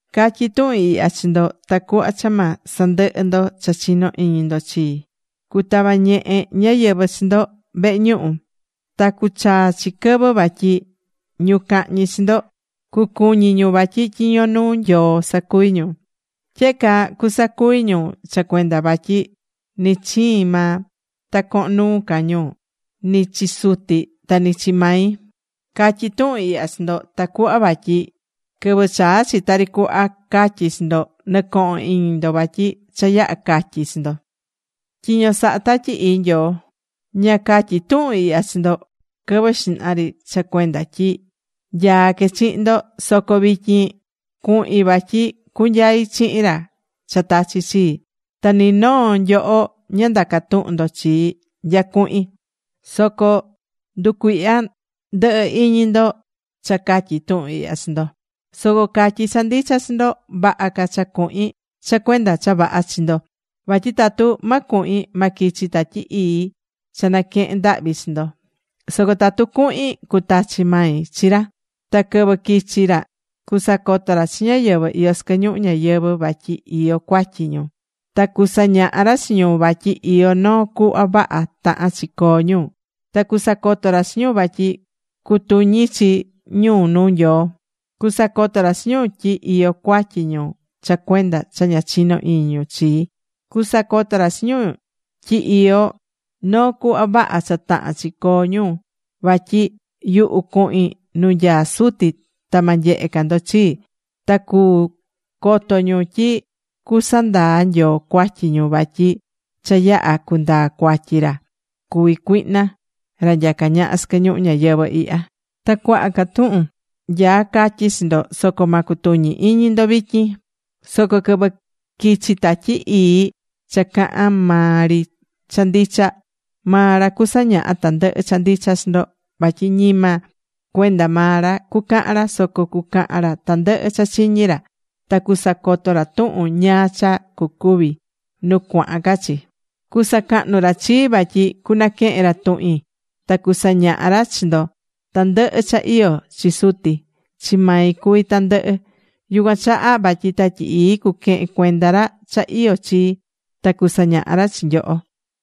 ’Catyí tuhun ihya chi ndo tacuhva cha ma sandɨhɨ ndo cha chinó iñi ndo chii. Cutava ñehe ñáyɨvɨ chi ndo vehe ñuhu. Ta cuchaa chi quɨvɨ vatyi ñu cahñi chi ndo, cucuñi ñu vatyi tyiño nuu Nyoo sacuví ñu. Tyehe caa cusacuvi ñu cha cuenda vatyi ni chiin maa ta cohon nuu ca ñu ni chi Suti ta ni chi mai. Catyí tuhun ihya chi ndo tacuhva vatyi quɨvɨ chaa chi tari cuhva catyí chi ndo, nɨcohon iñi ndo vatyi cha yaha̱ catyi̱ chi ndo. Tyiño sahá Tatyi Ii Nyoo ’Ña catyi̱ tuhun ihya chi ndo quɨvɨ xihna ri cha cuenda tyi nyaá que chihin ndo. Soco vityin cuhin vatyi cunyai chihin ra cha tachi̱ chii. Ta ni noo nyoho ña ndacá tuhun ndo chii nya cuhin. Soco nducuihya ndɨhɨ iñi ndo cha catyí tuhun ihya chi ndo. Soco catyí cha ndicha chi ndo: vaha ca cha cuhin cha cuenda cha vaha chi ndo. Vatyi tatu ma cuhin, ma quichi Tatyi Ii cha naquehen ndahvi chi ndo. Soco tatu cuhin, cutachi mai chi ra. Ta quɨvɨ quichi ra cusacoto ra chi ñáyɨvɨ iyó sɨquɨ ñuhu ñayɨvɨ̱ vatyi iyó cuatyi ñu. Ta cusañaha ra chi ñu vatyi iyó noo cuhva vaha tahán chi coo ñu. Ta cusacoto ra chi ñu vatyi cutuñi chi ñu nuu Nyoo. Cusacoto ra chi ñu tyi iyó cuatyi ñu cha cuenda cha ña chinó iñi ñu chii. Cusacoto ra chi ñu tyi iyó noo cuhva vaha cha tahán chi coo ñu, vatyi yuhu cuhin nu nyaá Suti ta ma nyehe ca ndo chii. Ta cu coto ñu tyi cusandaa Nyoo cuatyi ñu vatyi cha yaha̱ cundaa̱ cuatyi ra cuví cuihna, ra nyacá ñaha sɨquɨ ñuhu ñayɨvɨ̱ ihya. ’Ta cuaha ca tuhun nyaá catyi chi ndo, soco ma cutuñi iñi ndo vityin. Soco quɨvɨ quichi Tatyi Ii cha cahán maa ri cha ndicha, maa ra cusañaha tandɨhɨ cha ndicha chi ndo. Vatyi ñima cuenda maa ra cucahan ra, soco cucahan ra tandɨhɨ cha chiñí ra. Ta cusacoto ra tuhun ñáá cha cucuvi nu cuahan ca chi. Cusacahnu ra chii, vatyi cunaquehen ra tuhin ta cusañaha ra chi ndo. Tandɨhɨ cha iyó chi Suti, chi mai cuví ñandɨhɨ. Yucuan chaha vatyi Tatyi Ii cuquehen cuenda ra cha iyó chii, ta cusañaha ra chi nyoho.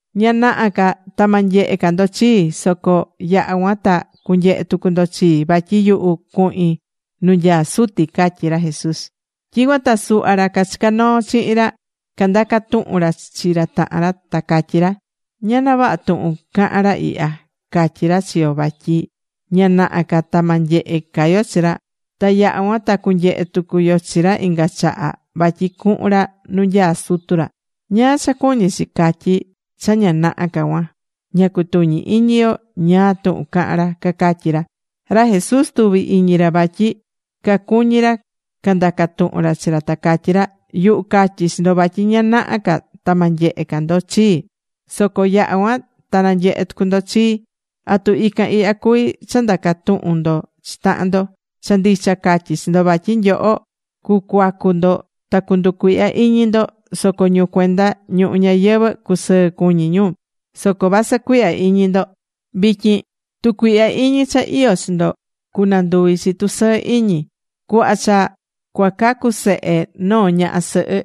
’Ña naha ca ta ma nyehe ca ndo chii, soco yaha cuan ta cunyehe tucu ndo chii, vatyi yuhu cuhin nu nyaá Suti ―catyí ra Jesús. Tyicuan ta suhva ra cachicá noo chihin ra, candaca tuhun ra chi tahan ra ta catyí ra: ―¿Ñana vaha tuhun cahán ra ihya? Catyí ra chi yo vatyi ña naha ca ta ma nyehe ca yo chi ra, ta yaha cuan ta cunyehe tucu yo chi ra inga chaha vatyi cuhun ra nu nyaá Sutu ra. ¿Ñáá cha cuñí chi catyi cha ña naha ca cuan? Ña cutuñí iñi yo ñáá túhun cahan ra ―cacatyí ra. Ra Jesús tuvi̱ iñi ra vatyi cacuñí ra candaca tuhun ra chi ra, ta catyí ra: ―Yuhu catyi̱ chi ndo vatyi ña naha ca ta ma nyehe ca ndo chii, soco yaha cuan ta nanyehe tucu ndo chii. ¿Atu ican ihya cuví cha ndacá tuhun ndo chi tahan ndo? Cha ndicha catyí chi ndo vatyi nyoho cucuacu ndo ta cunducuihya iñi ndo, soco ñu cuenda ñuhu ñayɨvɨ̱ cusɨɨ cuñi ñu. Soco vasɨ cuihya iñi ndo vityin, tucuihya iñi cha iyó chi ndo cunanduvi chi tusɨɨ iñi. Cuhva cha cuacacu sehe noo ñaha sɨhɨ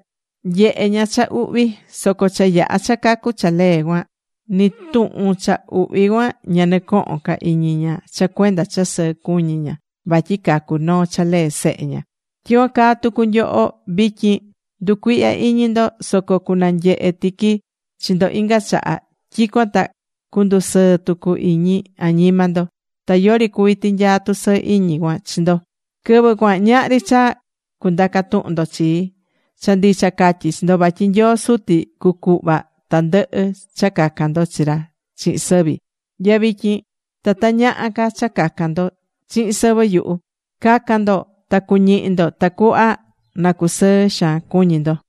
nyehé ña cha uhvi. Soco cha yaha cha cacu cha lee cuan, ni tuhun cha uhvi cuan ña nɨcohon ca iñi ña cha cuenda cha sɨɨ cuñí ña vatyi cacu̱ noo cha lee sehe ña. Tyicuan caa tucu nyoho vityin, nducuihyá iñi ndo. Soco cunanyehe tiqui chi ndo inga chaha. Tyicuan ta cundusɨɨ tucu iñi añima ndo. Ta yori cuví tinyaa tusɨɨ iñi cuan chi ndo. ’Quɨvɨ cuan ñahri ca cha cundaca tuhun ndo chii. Cha ndicha catyí chi ndo vatyi Nyoo Suti cucuhva tandɨhɨ cha cacan ndo chi ra chihin sɨvi. Nya vityin ta ta ñaha ca cha cacan ndo chihin sɨvɨ yuhu. Ca̱can ndo ta cuñihi ndo tacuhva na cusɨɨ xaan cuñi ndo.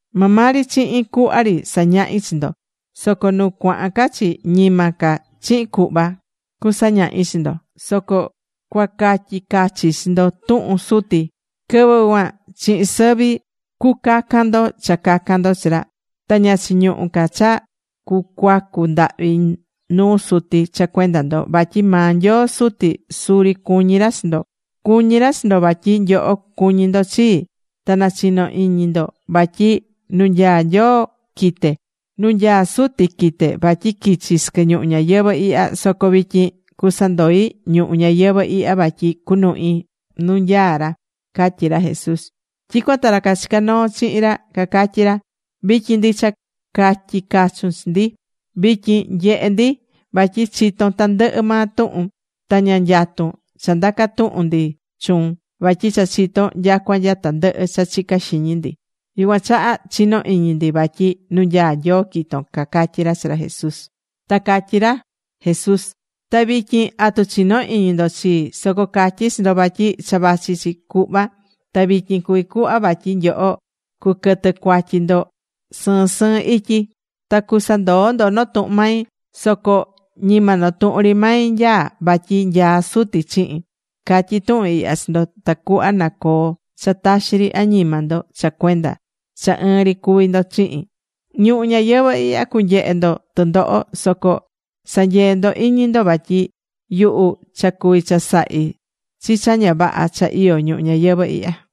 ’Maa maa ri chihin cuhva ri sañahí chi ndo. Soco nu cuahan ca chi, ñima ca chihin cuhva cuasañahi chi ndo, soco cuacatyi cachi chi ndo tuhun Suti. Quɨvɨ cuan chihin sɨvi cucacan ndo cha cacan ndo chi ra. Ta ña chiñuhú ca cha cucuacu ndahvi nuu Suti cha cuenda ndo. Vatyi maa Nyoo Suti suri cuñí ra chi ndo. Cuñí ra chi ndo vatyi nyoho cuñí ndo chii. Ta nachinó iñi ndo vatyi nu nyaá Nyoo quite̱. Nu nyaá Suti quite̱ vatyi quichi sɨquɨ ñuhu ñayɨvɨ̱ ihya. Soco vityin cusandoi ñuhu ñayɨvɨ̱ ihya vatyi cunuhi nu nyaá ra ―catyí ra Jesús. Tyicuan ta ra cachicá noo chihin ra cacatyí ra: ―Vityin ndicha catyí cachun chi ndi. Vityin nyehe ndi vatyi chitón tandɨhɨ maa tuhun, ta ña nyatun cha ndaca tuhun ndi chuun, vatyi cha chitón nyacua nya tandɨhɨ cha chicá xiñi ndi. Yucuan chaha chinó iñi ndi vatyi nu nyaá Nyoo quito̱n ―cacatyí ra chi ra Jesús. Ta catyí ra Jesús: ―Ta vityin ¿atu chinó iñi ndo chii? Soco catyí chi ndo vatyi cha vachi chi cuhva ta vityin cuví cuhva vatyi nyoho cuquɨtɨ cuatyi ndo sɨɨn sɨɨn ityi, ta cusandoo ndo notuhun mai. Soco ñima notuhun ri mai nyaá, vatyi nyaá Suti chihin. Catyí tuhun ihya chi ndo tacuhva na coo cha taxi ri añima ndo cha cuenda cha ɨɨn ri cuví ndo chihin. Ñuhu ñayɨvɨ̱ ihya cunyehe ndo tɨndoho, soco sa̱nyee ndo iñi ndo vatyi yuhu cha cuvi̱ chasahi chi cha ña vaha cha iyó ñuhu ñayɨvɨ̱ ihya.